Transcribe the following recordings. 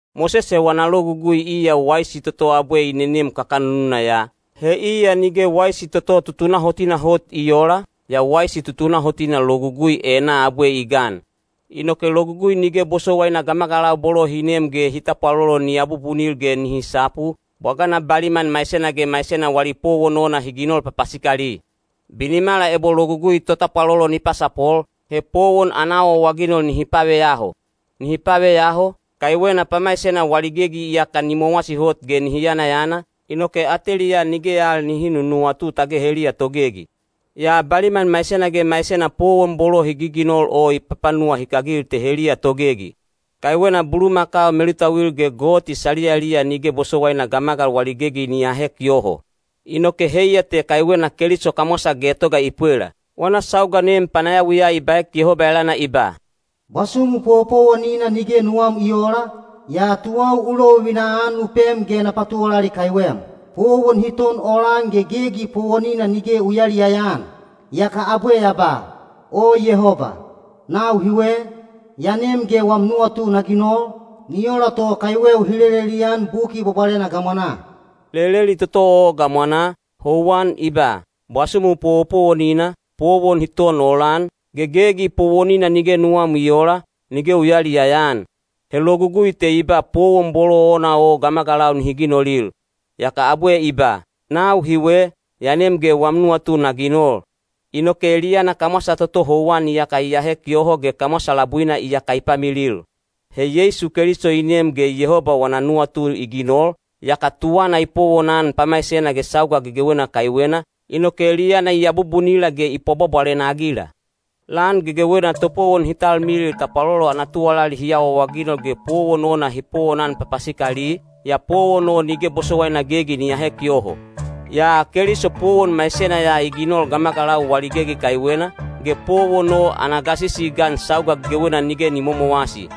Mosese wana Logugui iya waisi toto abwe i nenem kakanununa ya, he iya nige waisi toto tutunahotina hot i oola, yaa waisi tutunahotina Logugui enaa abwe i gan. Inoke Logugui nige bosowaina gamagalau bolo hi nem ge hi tapwalolo ni abubunil ge nihi sapu, bwagana baliman maisena ge maisena wali powon ona hi ginol papasikali. Binimala ebo Logugui totapwalolo ni pasapol, he powon ana awaawaginol nihi paveyaho. Nihi paveyaho, kaiwena pamaisena wali gegi iyaka ni mowasi hot ge nihi yanayana, inoke ateliyaa nige al nihi nunuwatu tage heliya togegi. Yaa baliman maisena ge maisena powon bolo hi giginol o i papanuwahikagil te heliya togegi. Kaiwena bulumakau melutauil ge goti saliyaliya nige bosowaina gamagalau wali gegi ni ahek yoho. Inoke heiya te kaiwena Keliso kamwasa getoga i pwela. Wana sauga nem panayawiya i baek Yehoba elana i ba: Bwasumu powopowonina nige nuwam i oola, yaa tuwau u lovivina-an u pem ge na patuwalali kaiwem. Powon hi ton olan ge gegi powonina nige u yayaliyaya-an. Yaka abwe ya ba, “O Yehoba, nau hiwe, ya nem ge wam nuwatu na ginol, ni ola to kaiweu hi lelelian Buki Bwabwalena gamwanaa.” Leleli toto o gamwanaa, houwan i ba, “Bwasumu powopowonina, powon hi ton olan, ge gegi powonina nige nuwam i oola, nige u yayaliyaya-an.” (He Logugui te i ba powon bolo ona o gamagalau nihi ginolil.) Yaka abwe i ba, “Nau hiwe, ya nem ge wam nuwatu na ginol.” Inoke eliyana kamwasa toto houwan iyaka i ahek yoho ge kamwasa labuina iyaka i pamilil. He Yeisu Keliso i nem ge Yehoba wana nuwatu i ginol, yaka tuwana i powonan pamaisena ge sauga gegewena kaiwena, inoke eliyana i abubunila ge i pwabwabwalena-agila. Lan gegewena topowon hi talmilil tapwalolo ana tuwalali hi awaawaginol ge powon ona hi powonan papasikali, yaa powon o nige bosowaina gegi ni ahek yoho. Yaa Keliso powon maisena ya i ginol gamagalau wali gegi kaiwena, ge powon o ana gasisi i gan sauga gegewena nige ni momowasi.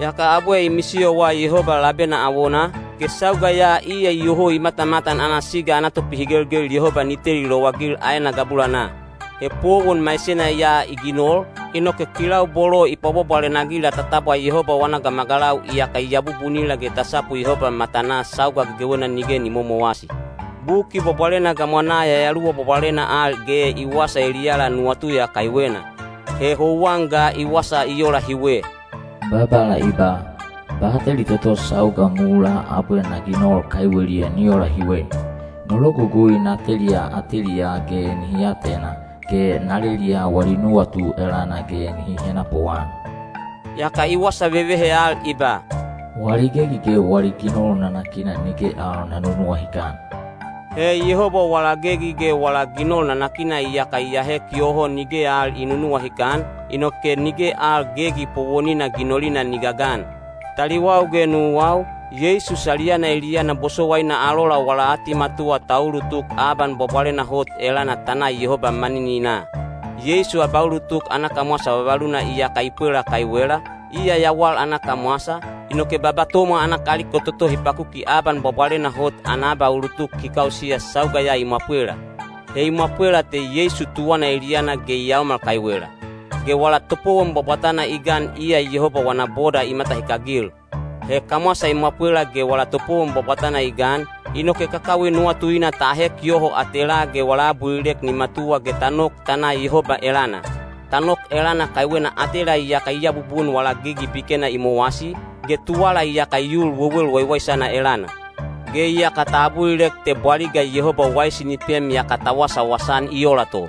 Yaka abwe i misiyowa Yehoba labena awonaa, ge sauga ya iya iyoho i matamatan ana siga ana topihigelgel Yehoba ni teli lowagil aena gabulanaa. He powon maisena ya i ginol, inoke kilau bolo i pwabwabwalena-agila ta tabwa Yehoba wana gamagalau iyaka i abubunila ge ta sapu Yehoba matanaa sauga gegewena nige ni momowasi. Buki Bwabwalena gamwanaa Yayaluwa Bwabwalena al ge i wasa eliyala nuwatu ya kaiwena. He houwan ga i wasa i ola hiwe: Babala i ba, “Bateli toto sauga mulaa abwe na ginol kaiweliya ni ola hiwe. No logugui na teliya ateliyaa ge nihi atena, ge na leliya wali nuwatu elana ge nihi henapuan.” Yaka i wasa vevehe al i ba, “Wali gegi ge wali ginol nanakina nige al na nunuwahikan.” He Yehoba wala gegi ge wala ginol nanakina iyaka i ahek yoho nige al i nunuwahikan, inoke nige al gegi powonina ginolina ni gagan. Taliwau ge nuwau, Yeisu saliyana eliyana bosowaina alola wala atimatuwa ta ulutuk Aban Bwabwalena Hot elana ta na Yehoba manininaa. Yeisu abaulutuk ana kamwasa vavaluna iyaka i pwela kaiwela, iya yawal ana kamwasa, inoke baba tomwa ana kaliko toto hi pakuki Aban Bwabwalena Hot ana abaulutuk hi kausiya sauga ya i mwapwela. He i mwapwelaa te Yeisu tuwana eliyana ge i yaomal kaiwela. Ge wala topowon bwabwatana i gan iya Yehoba wana boda i matahikagil. He kamwasa i mwapwela ge wala topowon bwabwatana i gan, inoke kakawi nuwatuina ta ahek yoho atelaa ge wala abulilek ni matuwa ge ta nok ta na Yehoba elana. Ta nok elana kaiwena atela iyaka i abubun wala gegi bikena i mowasi, ge tuwala iyaka i ul wewel waiwaisana elana. Ge iyaka ta abulilek te bwaliga Yehoba waisi ni pem yaka ta wasawasa-an i ola to.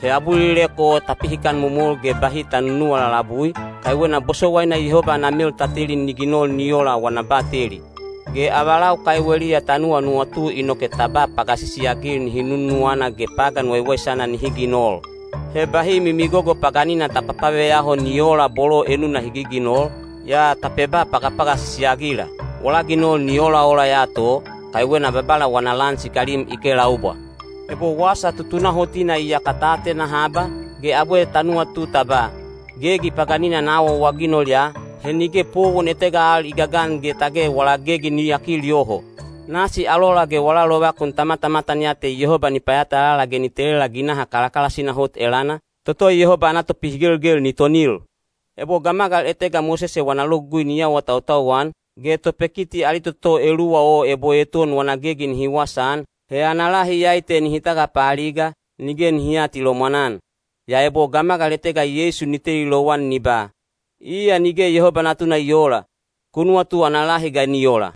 He abulilek o ta pihikan momol ge bahi ta nunuwa lalabui, kaiwena bosowaina Yehoba ana mel ta teli ni ginol ni ola wana bateli. Ge avalau kaiweliya ta nuwanuwatu inoke ta ba pagasisi-agil nihi nunuwana ge pagan waiwaisana nihi ginol. He bahi mimigogo paganina ta papaveyaho ni oola bolo enuna hi giginol, yaa ta peba pagapagasisi-agila. Wala ginol ni olaola ya to, kaiwena Babala wana lan sikalim i kelaubwa. Ebo wasa tutunahotina iyaka ta atena haba, ge abwe ta nuwatu ta ba, “Gegi paganina na awaawaginol ya,” he nige powon etega al i gagan ge tage wala gegi ni yakil yoho. Nasi alola ge wala lovakun ta matamatan ya te Yehoba ni payatalala ge ni telela ginaha kalakalasina hot elana, toto Yehoba ana topihigelgel ni tonil. Ebo gamagal etega Mosese wana Logugui ni awatautau-an, ge topekiti ali toto eluwa o ebo eton wana gegi nihi wasaan, he ana lahi iyai te nihi tagapaaliga, nige nihi aatilomwan-an. Yaa ebo gamagal etega Yeisu ni teli lowan ni ba, “Iya nige Yehoba Natuna i oola,” ku nuwatu ana lahi ga ni ola?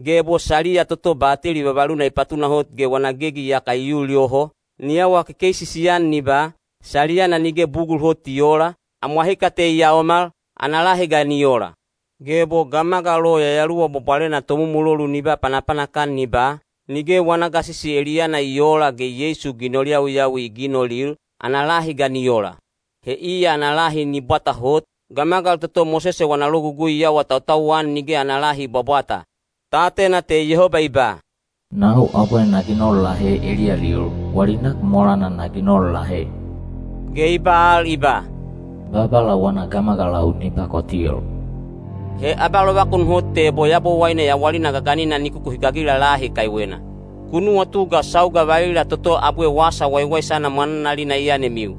Ge ebo saliya toto bateli vavaluna i patunahot ge wana gegi iyaka i ul yoho, ni awa kekeisisi-an ni ba, “Saliyana nige bugul hot i oola, amwahika te i yaomal,” ana lahi ga ni ola? Ge ebo gamagal o Yayaluwa Bwabwalena Tomumulolu ni ba panapanak-an ni ba, “Nige wana gasisi eliyana i oola ge Yeisu ginol yawiyawi i ginolil,” ana lahi ga ni ola? He iya ana lahi ni bwata hot, gamagal toto Mosese wana Logugui i awatautau-an nige ana lahi i bwabwata. Ta atena te Yehoba i ba, “Nau abwe na ginol lahe eliyalil, wali nak molana na ginol lahe.” Ge i ba al i ba, “Babala wana gamagalau ni pakotil.” He abalovakun hot te ebo Yabowaine yawalina gaganina ni kukuhikagila lahi kaiwena. Ku nuwatu ga sauga valila toto abwe Wasa Waiwaisana mwananalina i yanemiu.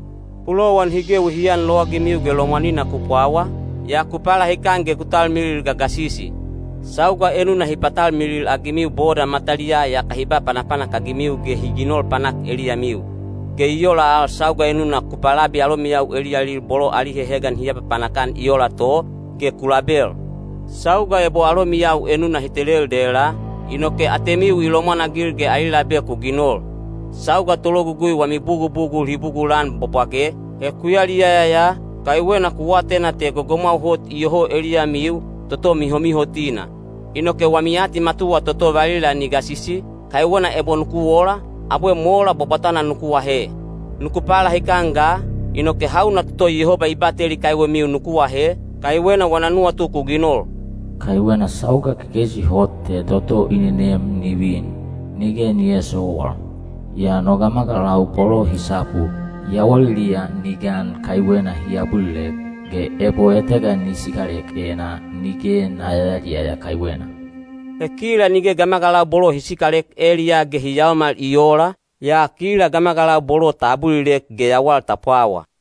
Pulowan hi gewi hi anlowagimiu ge lomwanina ku pwawa, yaa ku palahikan ge ku talmilil gagasisi. Sauga enuna hi patalmilil-agimiu boda mataliyaa yaka hi ba panapanak-agimiu ge hi ginol panak eliyamiu. Ge i ola al sauga enuna ku palabi alomiyau eliyalil bolo ali hehegan hi apapanak-an i ola to, ge ku label. Sauga ebo alomiyau enuna hi telel dela, inoke atemiu i lomwanagil ge ali labe ku ginol. Sauga tologugui wami bugubugul hi bugulan bwabwage, he ku yaliyaya ya, kaiwena ku atena te gogomwau hot iyoho eliyamiu, toto mihomihotina. Inoke wami atimatuwa toto valila ni gasisi, kaiwena ebo nuku ola, abwe mola bwabwatana nuku ahe. Nuku palahikan ga, inoke hauna toto Yehoba i bateli kaiwemiu nuku ahe, kaiwena wana nuwatu ku ginol. Kaiwena sauga kekeisi hot te toto i nenem ni vin, nige ni eesowal. Yaa no gamagalau bolo hi sapu, yawaliliya ni gan kaiwena hi abulilek, ge ebo etega ni sikalek enaa, nige na yayaliyaya kaiwena. He kila nige gamagalau bolo hi sikalek eliyaa ge hi yaomal i oola, yaa kila gamagalau bolo ta abulilek ge yawal ta pwawa.